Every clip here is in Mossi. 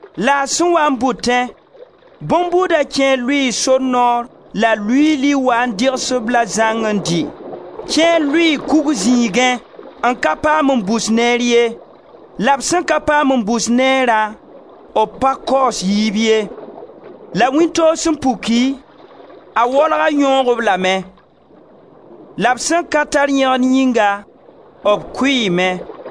la a sẽn waa n bʋtẽ, bõn-buuda kẽer lʋɩɩ sor noor la luiili waa n dɩgs-b-la zãnga n dɩ. Kẽer lʋɩɩ kug zĩigẽ, n ka paam n bus neer ye; la b sẽn ka paam n bus neerã b pa kaoos yiib ye. La wĩntoog sẽn puki, a waolga yõog-b lame. La b sẽn ka tar yẽgen yĩnga, b kʋɩɩme.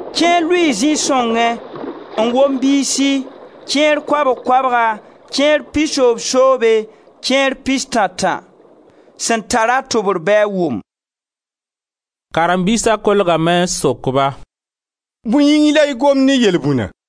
Kẽer lʋɩɩ zĩ-sõngẽ n wom biisi, kẽer koabg-koabga, kẽer pisoobsoobe, kẽer pistã-tã. Sẽn tar-a tʋbr bɩ a wʋm!» Karen-biisa kolgame n sok-ba: «Bõe yĩng la y gomd ne yelbũna?»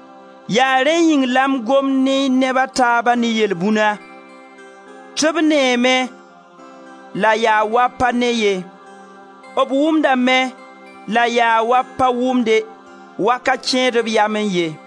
Yaa rẽ yĩng la m gomd ne neb a taaba ne yelbũna: tɩ b neeme la yaa waa b pa ne ye; b wʋmdame la yaa waa b pa wʋmde, wa ka kẽed b yamẽ ye.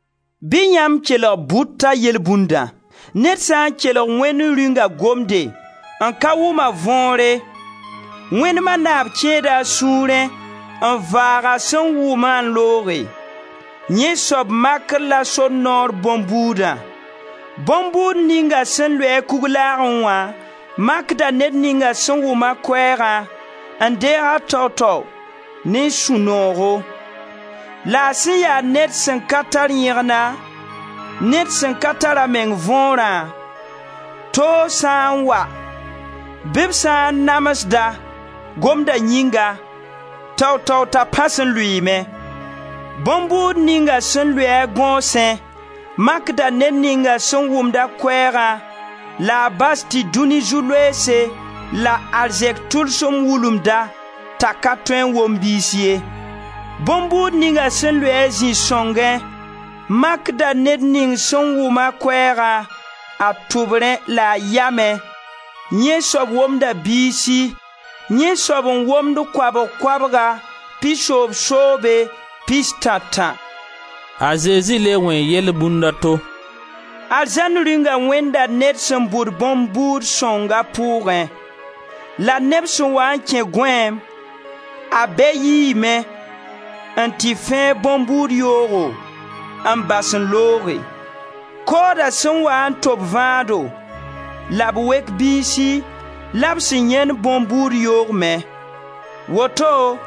Bɩ yãmb kelg bʋta yelbũndã. Ned sã n kelg Wẽnd Rĩunga gomde n ka wʋm a võore, wẽnema naab kẽeda a sũurẽ n vaag a sẽn wʋm-a n looge. Yẽ soab makr la sor noorẽ bõn-buudã. Bõn-buud ninga sẽn lʋɩ-a kuglaagẽ makda ned ninga sẽn wʋm-a koɛɛgã n deeg-a tao tao ne sũ-noogo. La a sẽn ya ned sẽn ka tar yẽgna, ned sẽn ka tar a meng võorã, toog sã n wa bɩ b sã n namsd-a, Gomda yĩnga, tao tao t'a pãs n lʋɩɩme. Bõn-buud ninga sẽn lʋɩ-a gõosẽ makda ned ninga sẽn wʋmd-a Koɛɛgã la a bas tɩ dũni zu-loeese la arzɛk tʋlsem wulumd-a t'a ka tõe n wom biis ye. Bõn-buud ninga sẽn lʋɩ-a zĩ-sõngẽ makda ned ning sẽn wʋm-a Koɛɛgã a tʋbrẽ la a yamẽ; yẽ soab womda biisi, yẽ soab n womd koabg-koabga, pisoobsoobe, pistã-tã.» B le wẽe yelbũnd a to: «Arzãn Rĩunga wẽnda ned sẽn bʋd bõn-buud sõng a pʋʋgẽ. La neb sẽn waa n kẽ gõeem, a bɛ yiime n tɩ fẽeg bõn-buud yoogo n bas n looge. Kooda sẽn waa n tob vãado la b wek biisi la b sẽn yẽnd bõn-buud yoog me. Woto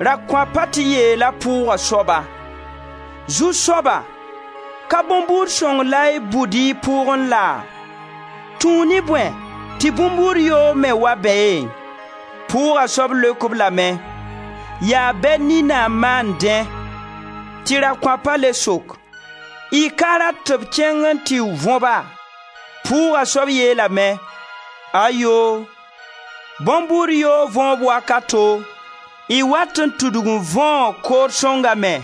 rakõapa tɩ yeela pʋʋga soaba: ‹Zu-soaba, ka bõn-buud sõng la y bʋd y pʋʋgẽ laa? Tũu ne bõe tɩ bõn-buud yoog me wa beẽ?› Pʋʋga soab leok-b lame: ‹Yaa bɛ nina n maan dẽ.› Tɩ rakõapa le sok: ‹Y ka rat tɩ d kẽng n tɩ võ ba?› Pʋʋga soab yeelame: ‹Ayoo! Bõn-buud yoogo võob wakato y wat n tudg n võo kood sõnga me.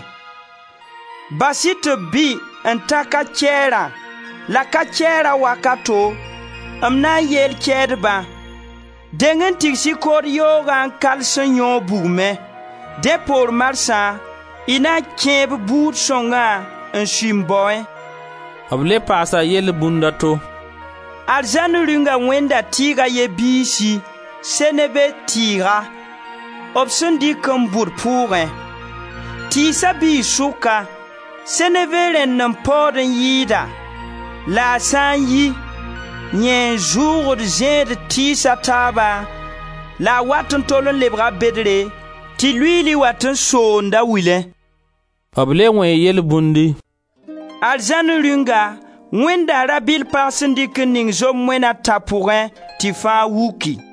Bas-y tɩ b bɩ n ta ka-kɛɛrã la ka-kɛɛra wakato m na yeel kɛɛdba: deng n tigs-y kood yoogã n kals n yõog bugmẽ. Dẽ poor marsã y na kẽeb buud sõngã n sui m baoẽ.›» B le paasa yelbũnd a to: «Arzãn Rĩunga wẽnda tɩɩg a ye biisi, seneve tɩɩga, b sẽn dɩk n bʋd pʋʋgẽ. Tɩɩsa biis sʋka seneve rẽnd n paood n yɩɩda la a sã n yi, yẽ n zʋʋgd zẽed tɩɩs a taaba la a wat n tol n lebga bedre tɩ luiili wat n soond a wilẽ.» B le wẽe yelbũndi: «Arzãn Rĩunga wẽnda rabɩll pag sẽn dɩk n ning zom moena a tã pʋgẽ tɩ fãa wuki.»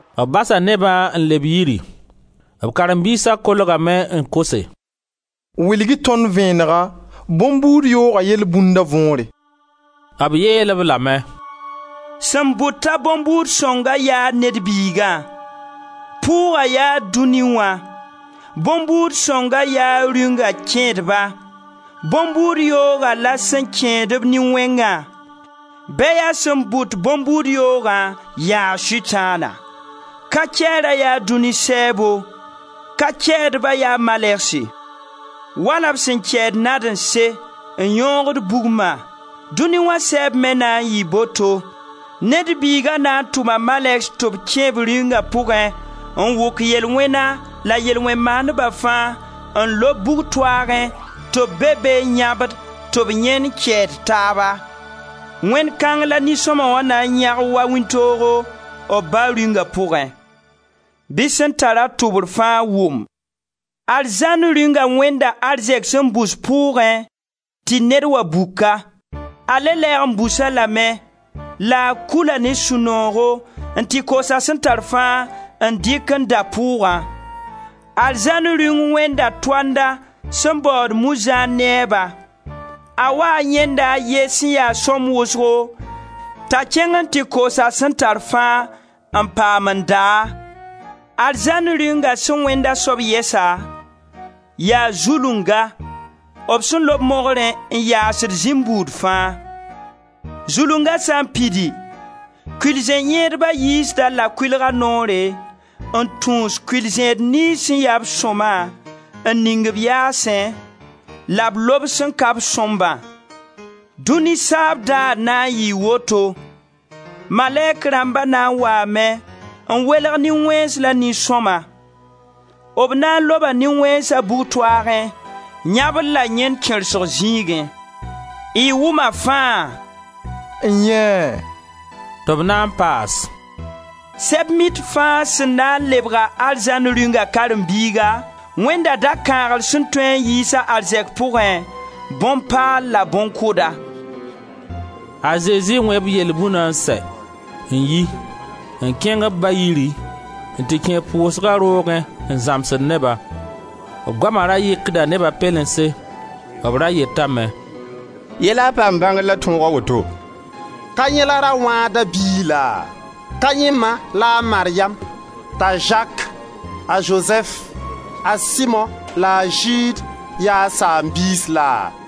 B basa nebã n leb yiri. B karen-biisa kolgame n kose: «Wilg-y tõnd vẽenega bõn-buud yooga yelbũnda võore.» B yeel-b lame: «Sẽn bʋt-a bõn-buud sõnga yaa Ned Biigã. Pʋʋga yaa dũni wã. Bõn-buud sõnga yaa Rĩunga kẽedba. Bõn-buud yooga la sẽn kẽed-b nin-wẽngã. Bɛyã sẽn bʋd bõn-buud yooga yaa Sʋtãana. Ka-kɛɛra yaa dũni sɛɛbo. Ka-kɛɛdba yaa malɛgse. Wala b sẽn kɛɛd nadẽnse n yõogd bugma, dʋni wã sɛɛb me na n yɩɩ boto. Ned Biiga na n tʋma malɛgs tɩ b kẽ b Rĩunga pʋgẽ n wʋk ye-lwẽna la yel-wẽn-maandba fãa n lob bug-toaagẽ tɩ b be be n yãbd, tɩ b yẽn kɛɛd taaba. Wẽnd kãng la nin-sõma wã na n yãg wa wĩntoogo, b Ba Rĩunga pʋgẽ. Bɩ sẽn tar-a tʋbr fãa wʋm! Arzãn Rĩunga wẽnda arzɛk sẽn bus pʋʋgẽ tɩ ned wa buk-a. A le lɛɛg n bus-a lame la a kula ne sũ-noogo n tɩ koos a sẽn tar fãa n dɩk n da pʋʋgã. Arzãn Rĩung wẽnda toanda sẽn baood muizãan neba. A waa n yãenda a ye sẽn ya sõmb wʋsgo t'a kẽng n tɩ koos a sẽn tar fãa n paam n da-a. Arzãn Rĩunga sẽn wẽnd a soab yɛsa: yaa zulunga, b sẽn lob mogrẽ n yaasd zĩm buud fãa. Zulunga sã n pidi, kʋɩl-zẽ-yẽedba yiisd-a-la kʋɩlga noore n tũus kʋɩl-zẽed niyns sẽn ya-b sõma n ning b yaasẽ la b lob sẽn ka-b sõmbã. Dũni saab daar na n yɩɩ woto: malɛk rãmba na n waame n welg nin-wẽns la nin-sõma. B na n loba nin-wẽnsa bug-toaagẽ, yãbr la yẽn kẽrsgo zĩigẽ.» «Y wʋma fãa?» «N-yẽe!» Tɩ b na n paas: «Sɛb-mit fãa sẽn na n lebg-a Arzãn Rĩunga karen-biiga, wẽnda dakãagr sẽn tõe n yiis a arzɛk pʋgẽ, bõn-paal la bõn-kʋda.» A Zezi wẽ b yelbũna n sɛ, n yi, n kẽng b ba-yiri n tɩ kẽ pʋʋsga roogẽ n zãmsd neba. B goama ra yɩkda neba pɛlense. B ra yetame: «Yɛ la a paam bãngr la tõog a woto? Ka yẽ la ra-wãada biig laa? Ka yẽ ma la a Maryam, t'a Zak, a Zozɛf, a Simo la a Zɩɩd yaa a saam-biis laa?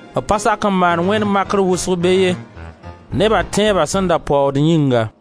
B pa sak n maan wẽnd makr wʋsg be ye, neba tẽeba sẽn da paood yĩnga.